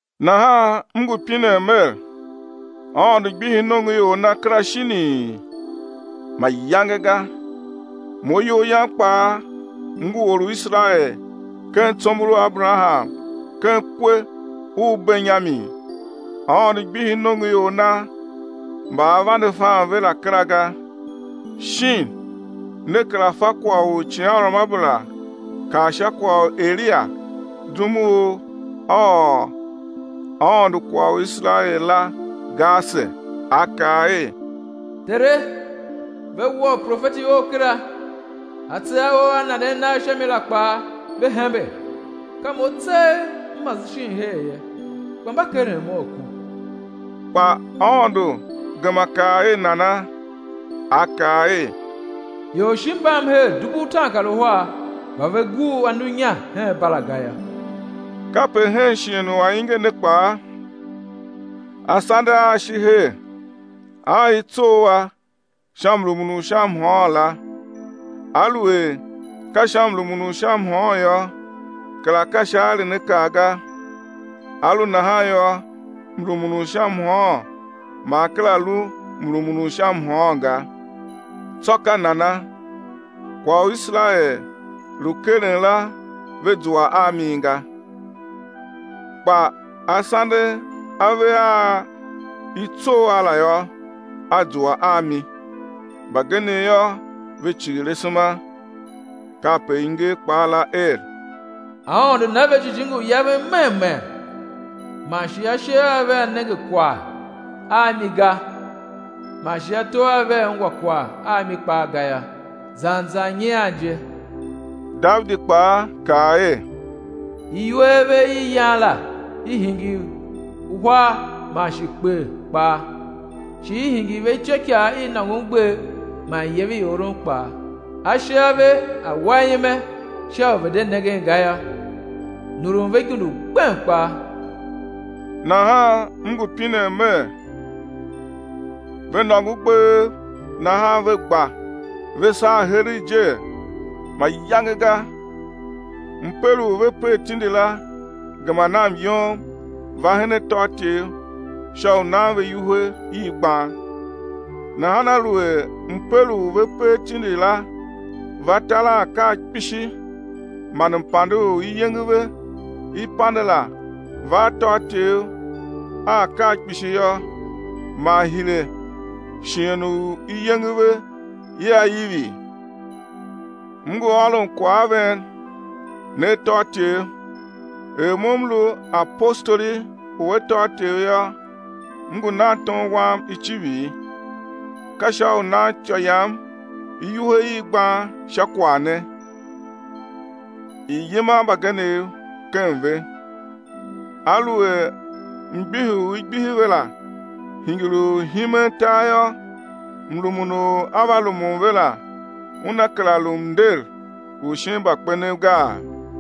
Nahan m ngu pinen mer, Aôndo gbihi nongoior Na kera shinii? Mayange ga. Mo iyol yam kpaa m ngu or u Iserael ken tsombor u Aberaham ken kwe u Benyamin. Aôndo gbihi nongoior Na mba A vande fan ve la kera ga. Shin ne kera fa kwagh u icighanruamabera kaa sha kwagh u Elia zum u A ôr Aôndo kwagh u Iserael la, ga ase? A kaa er: Tere, ve wua uprofeti Ou kera, atse a Ou a nanden nagh sha mi la kpaa, ve hembe. Ka mo tseegh m mase shin her ye, kpa mba keren mo a ku. Kpa Aôndo gema kaa er nana? A kaa er: Ior shi mbam her dubu utaankaruhar mba ve gur anu inya hen Bala ga yô. Kape hen shighe u ainge ne kpaa asande a shi her a i tsough a sha mrumun u sha mhôôn la. Aluer ka sha mrumun u sha mhôôn yô, kera ka sha aerenakaa ga, a lu nahan yô, mrumun u sha mhôôn ma a kera lu mrumun u sha mhôôn ga. Tsô ka nana? Kwagh u Iserael lu keren la ve zua a mi ga. Kpa asande a ve a i tsough a la yô, a zua a mi; mbagenev yô, ve cighir asema. Kape i nger kpaa la er: Aôndo na ve jijingi u yaven mem mem man shi ashe a vea nenge kwagh a mi ga man shi ato a vea ungwa kwagh a mi kpaa ga yô, zan zan nyian je. Davidi kpaa kaa er: Iwer ve i yan la i̱ hingir hwar man shi kper kpaa, shi i̱ hingir ve ityôikaa i nôngon gbev man iyev i oron kpaa. Ashe a ve a̱ wa ime sha u ve̱ de nengen ga yô, nurun ve igundu gbem kpaa. Nahan m ngu pinen mer, ve nôngo gbev nahan ve gba ve saa heregh jee? Mayange ga. Mper u ve per tindi la gema na myom va hen atôatyev sha u nan ve iwuhe i gban. Nahan aluer mper u ve per tindi la va tar a akaa kpishi man mpande u iyenge ve i pande la va atôatyev a akaa kpishi yô, man hire shighe u iyenge ve ia ivi? M ngu ôron kwagh a ven, ne atôatyev. Er mo m lu apostoli u atôatyev yô, m ngu nan tom wam icivir, ka sha u nan ityô yam iwuhe i gban sha kwagh ne, i̱ yima mbagenev ken ve. Aluer mgbihi u i gbihi ve la hingir u himen tar yô, mrumun u á va rumun ve la una kera lu mnder u shin mbakpenev gaa?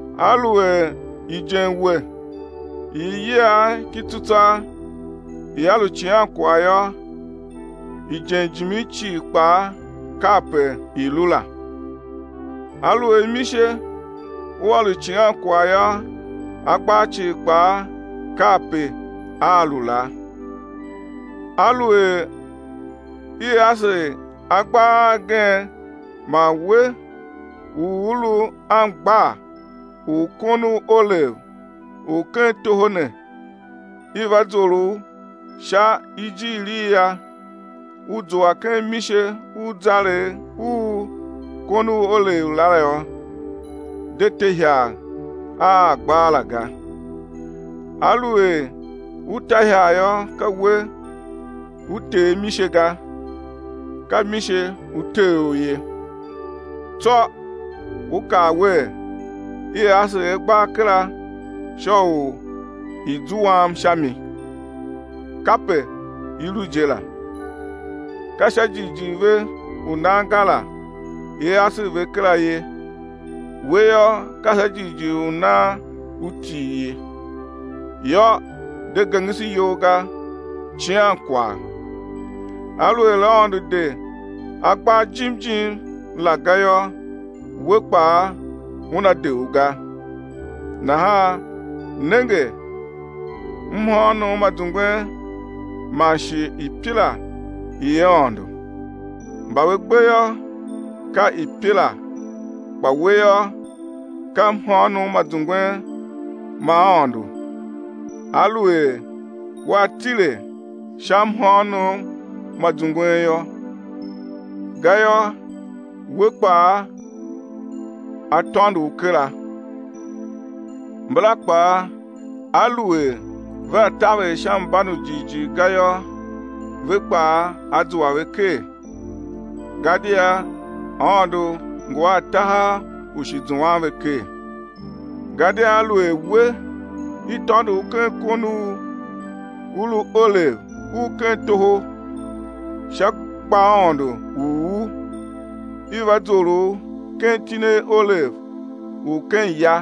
Aluer ijenmwe i iyiagh ki tsutswagh ia lu icighankwagh yô, ijen jimin cii kpaa kape i lu la. Aluer mise ua lu icighankwagh yô, agbaa cii kpaa kape a lu la. Aluer i asegh agbaa a gen man we u u lu angbaa u kon u olev u ken toho ne i va zor u sha ijiir i a, u zua ken mise u zaregh u kon u olev la yô, de te ihagh a agbaa la ga. Aluer u ta ihagh yô, ka we u tee mise ga, ka mise u tee u ye. Tsô u kaa wer, i asegh agbaa kera sha u i̱ zuam sha mi. Kape i lu je la. Ka sha jighjigh ve u nan ga la i asegh ve kera ye. We yô, ka sha jighjigh u nan u til ye. Yô, de gengese iyol ga, cian kwagh. Aluer Aôndo de agbaa jim jim la ga yô, we kpaa Una de u ga. Nahan nenge mhôônom ma zungwen man shi ipila i Aôndo. Mba ve gbe yô, ka ipila, kpa we yô, ka mhôônom ma zungwen ma Aôndo aluer wea tile sha mhôônom ma zungwen yô. Gayô, we kpaa á tôndo u kera. Mbala kpaa aluer vea taver sha mban u jighjigh ga yô ve kpaa á zua ve ker, gadia Aôndo ngu a tahav ú shi zuan ve ker. Gadia aluer we, i tôndo u ken kon u u lu olev u ken toho sha gbaaôndo u u, i va zor u ken itine olev u ken ya,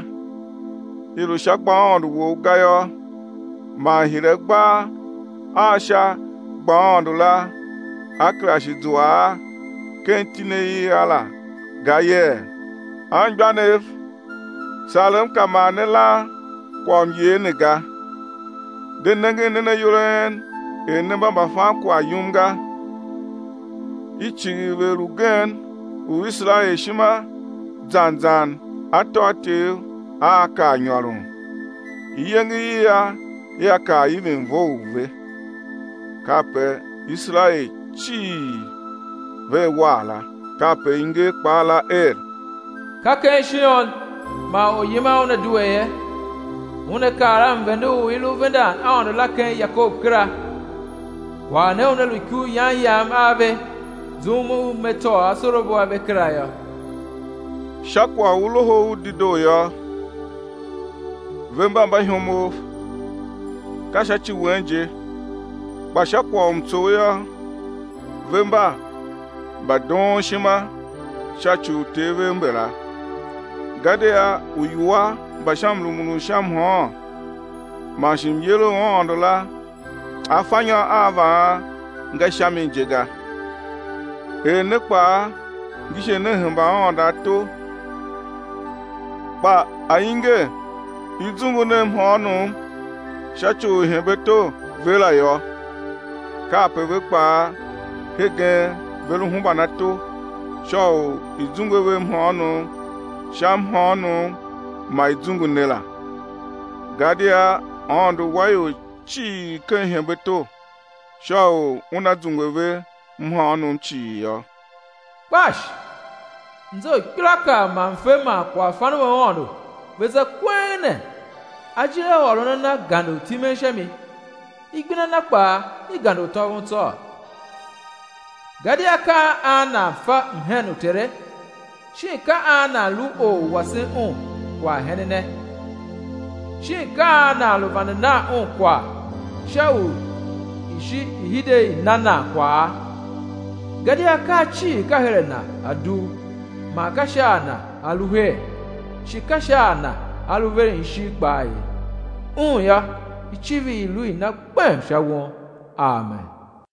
i lu sha gbaaôndo wou ga yô, man hire agbaa a sha gbaaôndo la á kera shi zua a ken itine i a la ga yee? Anmgbianev, sarem ka ma ne lan kwaghmyer ne ga, de nengen nen ayol a en er ne mba mbafankwagh yum ga. I cighir vegher ugen u Iserael ishima zan zan atôatyev aa kar nyôron, iyenge i a ia kar ivin vough ve. Kape Iserael cii vea war la. Kape i nger kpaa la er: Ka ken Shion man Oryiman Una due ye, Una kar a mvende u i lu vendan Aôndo la ken Yakob kera. Kwagh ne una lu ikuryan Yam a ve zum u Me tôô asorabo a ve kera yô. Sha kwagh u Loho u Dedoo yô ve mba mbaihomov, ka sha ci wen je, kpa sha kwagh u mtsough yô, ve mba mbadoonshima sha ci u uter vev mbala. Gadia uiwua mba sha mrumun u sha mhôôn man shi myer u Aôndo la afanyô a vaan nga sha mi je ga. Er ne kpaa ngise ne hemba Aôndo ato kpa ainge i zungu ne mhôônom sha ci u ihembeato ve la yô, kape ve kpaa, hegen ve lu hemban ato sha u i̱ zungwe ve mhôônom sha mhôônom ma i zungu ne la. Gadia Aôndo wa ior cii ken ihembeato sha u Una zungwe ve mhôônom cii yô. Kpash! Mze u ikpelaakaa man mfe man kwaghfan u Aôndo ve za kweng ne! Ajir a ôron a Na gande u timen sha mi, igbenda Na kpaa i gande u tôvon tsôô! Gadia ka an nan fe mhen u Tere? Shin ka an nan lu or u wasen Un kwaghhenene? Shin ka an nan lu vande nan Un kwagh sha u i̱ shi i̱ hide i̱ na nan kwagha? Gadia akaa cii ka her a Na a dugh, man ka sha a Na a lu her, shi ka sha a Na a lu veren ishigh kpaa ye. Un yô, icivir i̱ lu i Na gbem sha won. Amen.